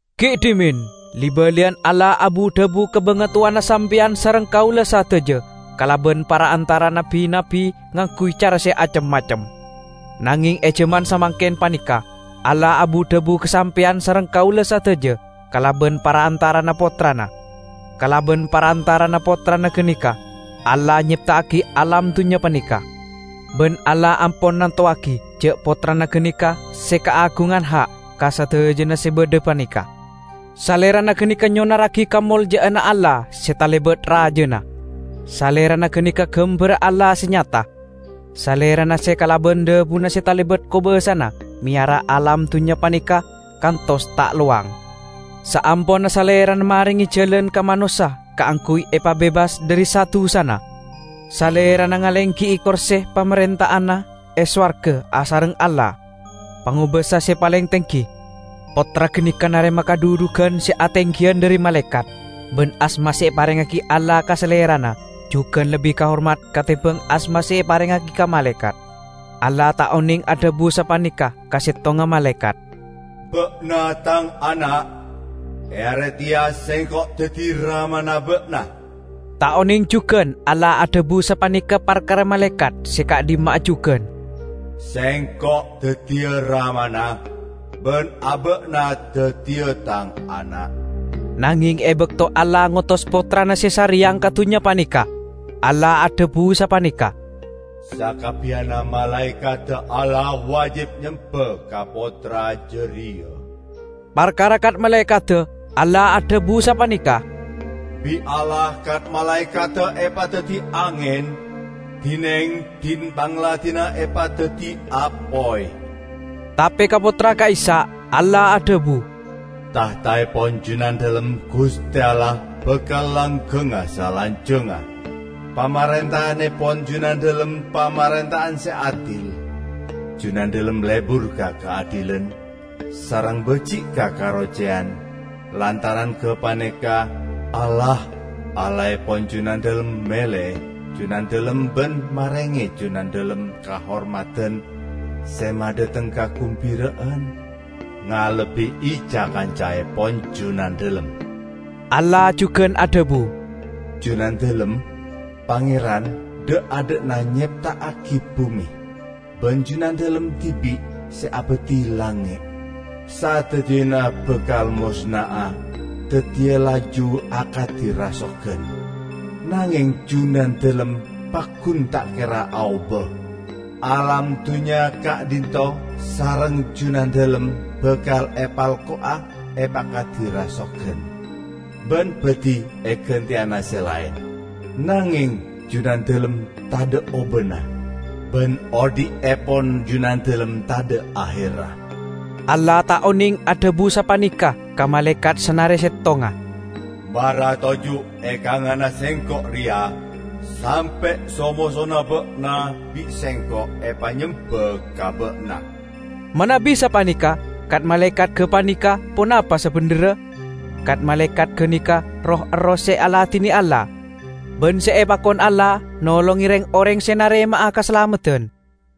Gi' dhimen li-baliyan Allah abu-dhabu ka bangatowana sampeyan sareng kaula sadaja kalaban parantara'anna bi-nabbi ngangguy cara se acem-macem. Nangeng e jaman samangken paneka Allah abu-dhabu ka sampeyan sareng kaula sadaja kalaban parantara'anna Pottrana. Kalaban parantara'anna Pottrana ganeka Allah nyepta'agi alam dunnya paneka. Ban Allah ampon nantowagi ja' Pottrana ganeka se kaagungan ha' ka sadajana se badha paneka. Salerana ganeka se nyonarragi kamolja'anna Allah se talebat rajana; Salerana ganeka gambarra Allah se nyata. Salerana se kalaban dhabuna se talebat kobasana meyara alam dunnya paneka kantos ta' lowang. Saamponna Salerana marenge jalan ka manossa kaangguy epabebas dhari sa-dusana, Salerana ngalenggi'i korse pamarenta'anna e sowarga asareng Allah, Pangobasa se paleng tenggi. Pottra ganeka narema kadhudhugan se atenggiyan dhari malaekat, ban asma se eparengngagi Allah ka Salerana jugan lebbi kahormat katembang asma se eparengngagi ka malaekat. Allah ta' oneng adhabu sapaneka ka settonga malaekat, "Ba'na Tang ana'; e are teya Sengko' daddi Ramana ba'na." Ta' oneng jugan Allah adhabu sapaneka parkara malaekat se ka'dhimma'a jugan, "Sengko' daddiya Ramana, ban aba'na daddiya Tang ana'." Nangeng e bakto Allah ngotos Pottrana se sareyang ka dunnya paneka, Allah adhabu sapaneka, "Sakabbiyanna malaekadda Allah wajib nyemba ka Pottra jareya." Parkara kat-malaekadda Allah adhabu sapaneka, "Bi' Allah kat-malaekadda epadaddi angen, dineng din-pangladinna epadaddi apoy." Tape ka Pottra ka'issa', Allah adhabu, "Tahtaepon Junandalem, Guste Allah, bakal langgengnga salanjangnga! Pamarenta'annepon Junandalem pamarenta'an se adil. Junandalem lebur ka kaadilan, sareng baji' ka karoceyan; lantaran gapaneka, Allah, Allahepon Junandalem mele Junandalem ban marenge Junandalem kahormadan se madhateng kagumbira'an, ngalebbi'i ca-kancaepon Junandalem." Allah jugan adhabu, "Junandalem, Pangeran, dha'-adha'na nyepta'agi bume, ban Junandalem dibi' se abadhi langnge'. Sadajana bakal mosna'a, daddiya laju akadi rasogan; nangeng Junandalem paggun ta' kera aoba. Alam dunnya ka'dhinto' sareng Junandalem bakal epelko'a epakadi rasogan, ban badhi eganteyana se laen. Nangeng Junandalem tadha' obana, ban odhi'epon Junandalem tadha' aherra." Allah ta' oneng adhabu sapaneka ka malaekat sanare settonga, "Mara toju' e kanganna Sengko' reya, sampe' so-mosona ba'na bi' Sengko' epanyemba ka ba'na." Manabi sapaneka, kat-malaekat gapaneka ponapa sabendherra? Kat-malaekat ganeka roh-erroh se aladine Allah, ban se epakon Allah nolonge reng-oreng se narema'a kasalameddan.